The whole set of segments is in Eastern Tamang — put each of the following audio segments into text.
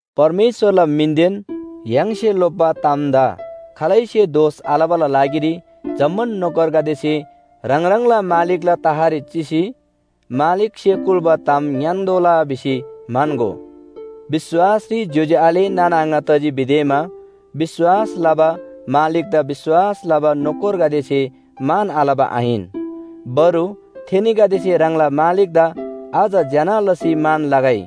परमेश्‍वरला मिनदेन य्‍हाङसे लोप्‍बा तामदा खालैसे दोष आलबाला लागिरी जम्‍मान नोकरगदेसे ह्राङ ह्राङला मालिकला तहरी चिसी मालिकसे कुल्‍बा ताम ङ्‌यान्‍तोःला भिसी म्‍हन्‍गो। विश्‍वासरी ज्‍योज्‍यो आले नाना आङा तजी भिदेमा विश्‍वास लबा मालिकदा विश्‍वास लबा नोकरगदेसे मान आलबा आहिन। बरु थेनीगदेसे ह्राङला मालिकदा अझ ज्‍यना लसी मान लगै।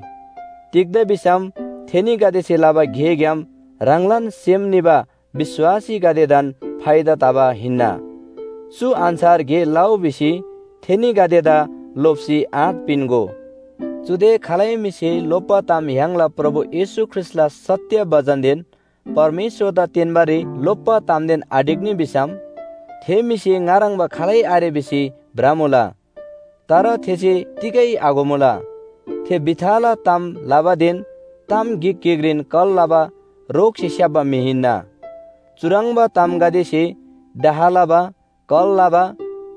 तिग्‍दा भिसम थेनीगदेसे लबा गेग्‍याम ह्राङलान सेम निबा विश्‍वासीगदेदान फाइदा तबा हिन्‍ना। चु अन्‍छार गे लउ भिसी थेनीगदेदा लोप्‍सी आँट पिन्‍गो। चुदे खालै म्‍हिसे लोप्‍बा ताम य्‍हाङला प्रभु येशू ख्रीष्‍टला सत्‍य बचनदेन परमेश्‍वरदा तेन्‍बारी लोप्‍बा तामदेन आढिक्‍नी भिसम थे म्‍हिसे ङा ह्रङ्‌बा खालै आरे भिसी भ्रमुला, तर थेसे तिगै आघोमुला। थे भिथाला ताम लबादेन ताम गिक गिकरी कल लबा रोगसे स्‍याप्‍बा म्‍हि हिन्‍ना। चुह्रङ्बा तामगदेसे डाह लबा, कल लबा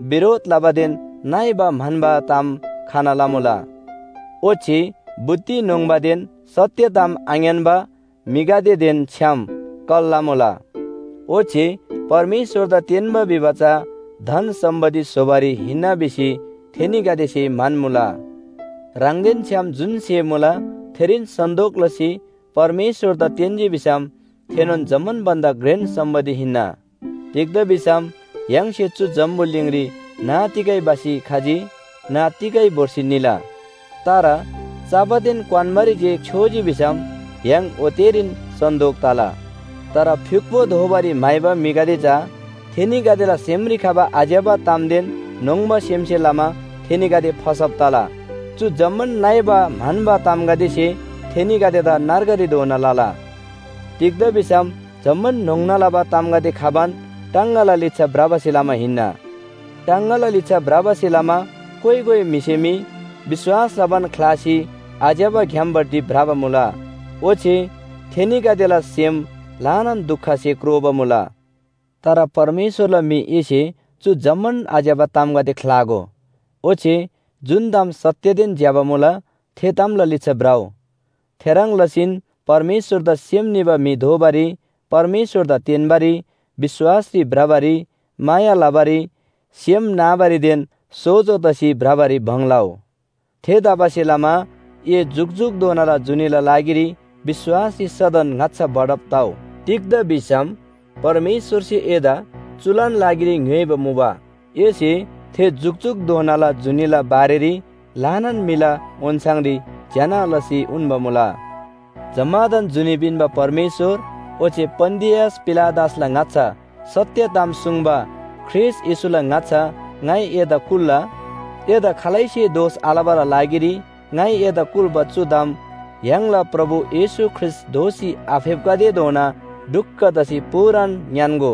बिरोध लबादेन नइबा म्‍हन्‍बा ताम खना लमुला। ओच्‍छे बुद्धि न्‍होङ्‍बादेन सत्‍य ताम आङ्‌यान्‍बा म्‍हिगदेदेन छ्‌याम कल लमुला, ओच्‍छे परमेश्‍वरदा तेन्‍बा भिबा चा धन सम्‍पत्ति स्‍होबारी हिन्‍ना भिसी थेनीगदेसे म्‍हन्‍मुला। ह्राङदेन छ्‌याम जुन स्‍हे मुला थेरीन सन्‍तोक लसी परमेश्‍वरदा तेन्‍जी भिसम थेनोन जम्‍मान भन्‍दा घ्रेन सम्‍पत्ति हिन्‍ना। तिग्‍दा भिसम य्‍हाङसे चु जम्‍बुलिङरी न्‍ह तिगै भसी खजी न्‍ह तिगै भोर्सी निला। तर चबादेन क्‍वान्‍बारी जे छ्‌योजी भिसम य्‍हाङ ओतेरीन सन्‍तोक तला। तर फ्‍युक्‍पो दोबारी म्‍हाइबा म्‍हिगदे चा थेनीगदेला सेमरी खबा आज्‍यबा तामदेन न्‍होङ्बा सेमसे लमा थेनीगदे फसब तला। चु जम्‍मान नइबा म्‍हन्‍बा तामगदेसे थेनीगदेदा नर्गरी धोना लला। तिग्‍दा भिसम जम्‍मान न्‍होङ्ना लबा तामगदे खबान टाङगाला लिच्‍छा भ्रबासे लमा हिन्‍ना। टाङगाला लिच्‍छा भ्रबासे लमा कोइ कोइ म्‍हिसे मी विश्‍वास लबान ख्‍लासी आज्‍यबा ग्‍यामपट्टि भ्रबा मुला, ओच्‍छे थेनीगदेला सेम ल्‍हानान दुखसे क्रोबा मुला। तर परमेश्‍वरला म्‍हि एसे चु जम्‍मान आज्‍यबा तामगदे ख्‍लागो। ओच्‍छे जुन ताम सत्‍यदेन ज्‍यबा मुला थे तामला लिच्‍छा भ्रउ। थेह्रङ् लसीन परमेश्‍वरदा सेम निबा म्‍हि दोबारी, परमेश्‍वरदा तेन्‍बारी, विश्‍वासरी भ्रबारी, माया लबारी, सेम नाबारीदेन सोजो तसी भ्रबारी भङ लउ। थेतबासेलमा ए जुकजुकधोनाला जुनीला लागिरी विश्‍वासरी सदन ङाच्‍छा बढब तउ। तिग्‍दा भिसम परमेश्‍वरसे एदा चुलान लागिरी ङ्‌योइबा मुबा। एसे थे जुकजुकधोनाला जुनीला बारेरी ल्‍हानान म्‍हिला ओन्‍छाङरी ज्‍यना लसी उन्‍बा मुला। जम्‍मादान जुनी पिन्‍बा परमेश्‍वर ओच्‍छे पन्‍तियस पिलातसला ङाच्‍छा सत्‍य ताम सुङ्बा ख्रीष्‍ट येशूला ङाच्‍छा ङाइ एदा कुल्‍ला। एदा खालैसे दोष आलबाला लागिरी ङाइ एदा कुल्‍बा चु ताम य्‍हाङला प्रभु येशू ख्रीष्‍ट दोःसी आफेप्‍खतेधोना ढुक्‍क तसी पूरान ङ्‌यान्‍गो।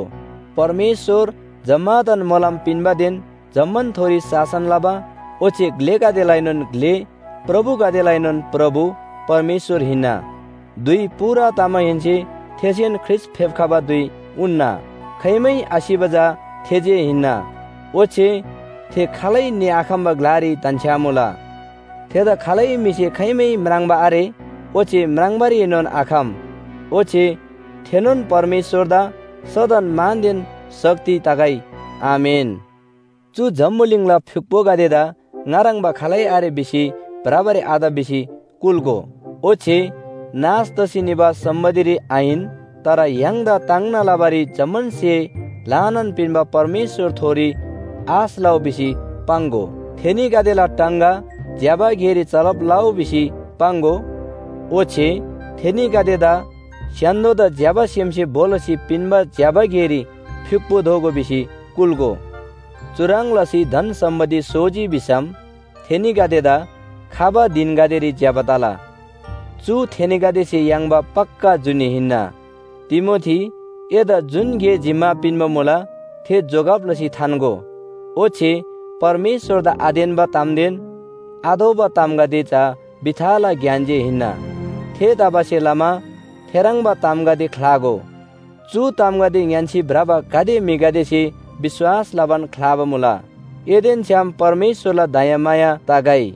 परमेश्‍वर जम्‍मादान मोलम पिन्‍बादेन जम्‍मानथोरी शासन लबा, ओच्‍छे ग्‍लेगदेलाएनोन ग्‍ले, प्रभुगदेलाएनोन प्रभु परमेश्‍वर हिन्‍ना। धुइ पूरा तमाहेन्‍से थेसेन ख्रीष्‍ट फेप्‍खबा धुइ उन्‍ना। खाइमै आसिबा चा थे जे हिन्‍ना, ओच्‍छे थे खालै निआखम्‍बा य्‍हालरी धन्‍छ्‌यामुला। थेदा खालै म्‍हिसे खाइमै म्राङ्बा आरे ओच्‍छे म्राङ्बारीएनोन आखम। ओच्‍छे थेनोन परमेश्‍वरदा सदन मानदेन शक्ति तगै। आमेन। चु जम्‍बुलिङला फ्‍युक्‍पोगदेदा ङा ह्रङ्‌बा खालै आरे भिसी भ्रबारी आत भिसी कुल्‍गो। ओच्‍छे नाश तसी निबा सम्‍पत्तिरी आहिन, तर य्‍हाङदा ताङ्ना लबारी जम्‍मान स्‍हे ल्‍हानान पिन्‍बा परमेश्‍वरथोरी आश लउ भिसी पाङ्‍गो। थेनीगदेला टाङगा ज्‍यबा गेरी चलब लउ भिसी पाङ्‍गो, ओच्‍छे थेनीगदेदा स्‍य्‍हान्‍दोदा ज्‍यबा सेमसे भो लसी पिन्‍बा ज्‍यबा गेरी फ्‍युक्‍पो दोगो भिसी कुल्‍गो। चुह्रङ् लसी धन सम्‍पत्ति सोजी भिसम थेनीगदेदा खबा धिनगदेरी ज्‍यबा तला। चु थेनीगदेसे याङ्बा पक्‍का जुनी हिन्‍ना। तिमोथी, एदा जुन गे जिम्‍मा पिन्‍बा मुला, थे जोगब लसी थान्‍गो। ओच्‍छे परमेश्‍वरदा आतेन्‍बा तामदेन आतोःबा तामगदे चा भिथाला ज्ञान जे हिन्‍ना। थेतबासेलमा थेह्रङ्बा तामगदे ख्‍लागो। चु तामगदे ङ्‌यान्‍सी भ्रबा गाते म्‍हिगदेसे विश्‍वास लबान ख्‍लाबा मुला। एदेन छ्‌याम परमेश्‍वरला दयामाया तगै।